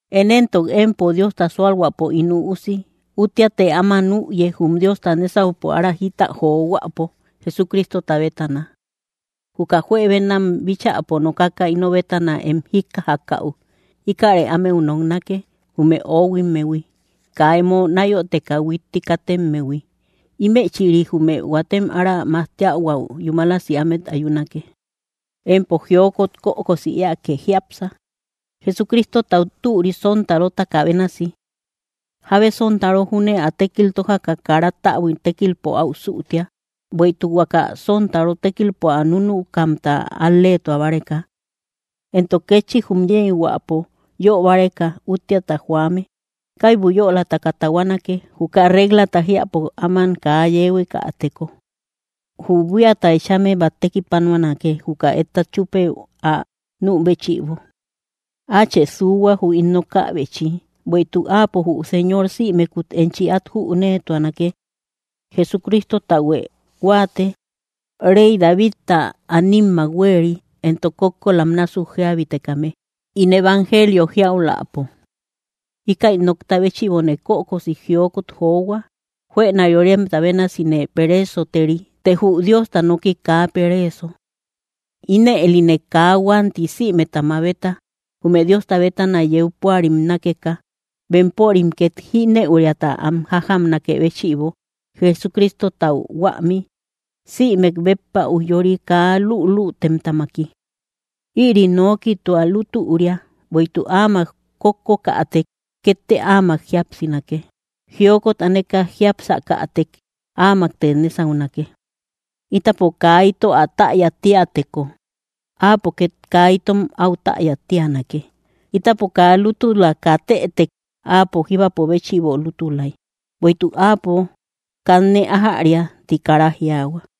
Én éntok empo, Diosta sualhuäpo ín üusi, úttiatë áma nüye, jum Diosta nésaupo ára jita johuäpo, Jesucristota bétana. Juka juebenam bíchäpo nokaka ino bétana em jíkkajakäu, íkäre ámeu noknake, jume oohuimmehui, kaa emo náyoteka huitti katemmehui; ímëchïri jume huatem ára majtiahuäu yúmalasi ámet ayunake. Empo jiokot kökosi éake jiápsa, Jesucristotau türi sontarotaka bénasi. Jábe sontaro júne ä tékil tójaka kara täbui tékilpo áu sütia, bueïtuk huaka sontaro tékilpo ä núnukamta al‑leetua báreka. Entok kétchi jum yeyhuäpo yö báreka úttiata joame, kaibu yölataka tahuanake, juka reglata jiäpo áman kaa yeehuekäteko. Jü buíata ëechame bát tekipanuanake, juka etta chúpey ä nü béchïbo. Áachë suuhua, jü ín nokäbechi; bueïtuk Áapo jü Señor sïmekut enchi át jüneetuanake. Jesucristotahuë huáate, rey Davidta animmak huéeri, entok kókkolam násuk jíabitekame, ín evangelio jíauläpo. Íkäi nokta béchïbone kökosi jiokot johua. Juëna yóremta bénasine pereesoteri; të jü Diosta nooki kaa pereeso. Inëlïne kaa huanti sïmeta mabeta, jume Diosta bétana yeu púarim nákeka, bempörim két jínëuriata am jájamnakë béchïbo, Jesucristotau huämi, sïmek béppa ujyori kaa lülütemtamaki. Ïri nooki tua lútüria: Bueïtuk áamak kókkokätek, kétte Áamak jíapsinake; jiokot aneka jiápsakätek, áamakte nésaunake. Ítapo kaa ito ä täya tíäteko, áapo két kaa itom áu täya tíanake. Ítapo kaa lútula katëtek, Áapo jíbapo béchïbo lútulay. Bueïtuk Áapo, “kanne ájäria”, ti kara jiaahua.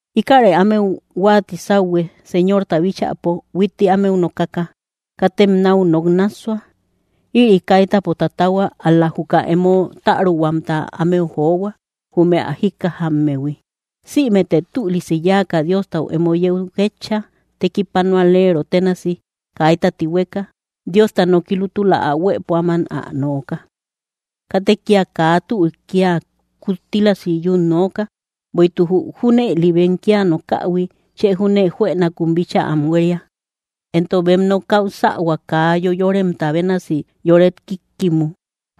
Íkäre ámeu huáati sáuhue, Señorta bíchäpo, huitti ámeu nokaka: “Katem náu nok nássua.” Ïri kaitäpo tatahua; ál‑la juka emo täruhuamta ámeu johua, jume ä jíkkajammehui. Sïmete tülisi yáaka, Diostau emo yeu ketcha, tekipanualero ténasi, kaita tihueka, Diosta noki lútula ä huëpo áman ä nooka. Katë kía kaa türik kia kuttílasi yun nooka, bueïtuk jü junëli bem kia nokähui chë júne juënakun bíchaa am huéria, entok bem nokäu sähua kaa yoyoremta bénasi yoret kíkkimu.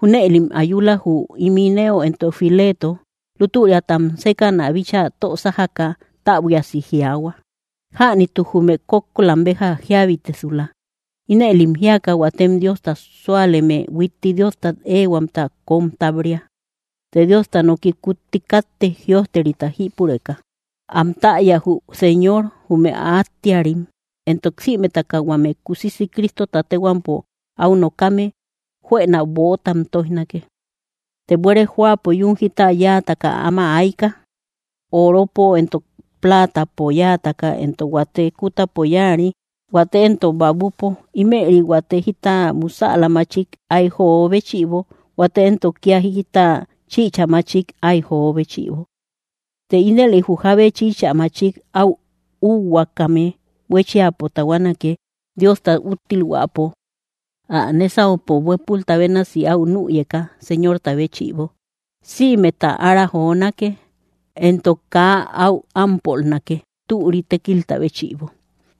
Júnëlim ayula, jü Himeneo entok Fileto. Lútüriatam sékäna bíchaa tö sájaka, täbuiasi jiaahua: “Jänituk jume kókkolam béja jíabitesula.” Inëlim jíaka, huatem Diosta súaleme huitti Diostat éehuamta kóm táb‑ria. Të Diosta noki kutti káttek, jïojterita jípureka: “Am täya jü Señor, jume ä áttiarim”; entok: “Sïmetaka huame kusisi Cristota téhuampo áu nokame, juëna böotam tóijnake.” Të buére jóapo yún jita yáataka áma ayka, oropo entok platapo yáataka, entok huate kútapo yáari, huate éntok babupo; ímëri huate jita musäla machik áy jo béchïbo, huate éntok kía jita chïcha machik áy jo béchïbo. Të ínëli jü jábe chïcha machik áu úhuaakame huéchiapo tahuanake, Diosta úttilhuäpo. Ä nésaupo huépulta bénasi áu nüyeka, Señorta béchïbo, sïmeta ára jonake; entok kaa áu ámpolnake, türi tékilta béchïbo.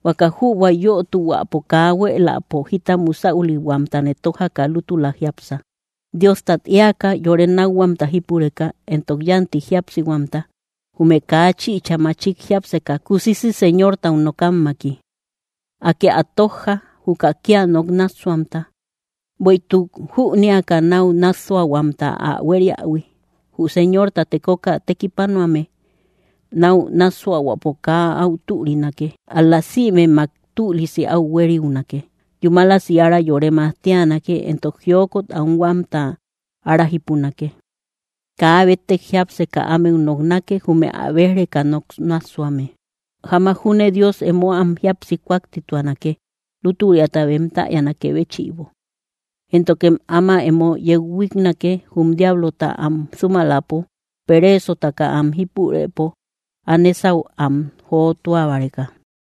Huaka jübua yötuhuäpo kaa huéeläpo jita musäulihuamtë tójaka lútula jiápsa, Diostat éaka, yore nákhuamta jípureka, entok yánti jíapsihuamta, jume kaa chïcha machik jiápseka kusisi Señortau nokammaki. Akë ä tójja, juka kia nok nássuahuamta, bueïtuk jünéaka, náu nássuahuamta ä huériähui. Jü Señorta tekoka tekipanuame náu nássuahuäpo kaa áu türinake; ál‑la sïmemmak tülisi áu hueriunake; yúmalasi ára yore majtianake, entok jiokot anhuamta ára jípunake. Kaa béttek jiápseka ámeu noknake, jume ä béj‑reka nok nássuame; jamak júne Dios emo am jíapsi kuaktituanake, lútüriata bem täyanakë béchïbo. Éntokem áma emo yeu huíknake, jum diablota am sumaläpo, pereesotaka am jípurëpo, ä nésau am jotua báreka.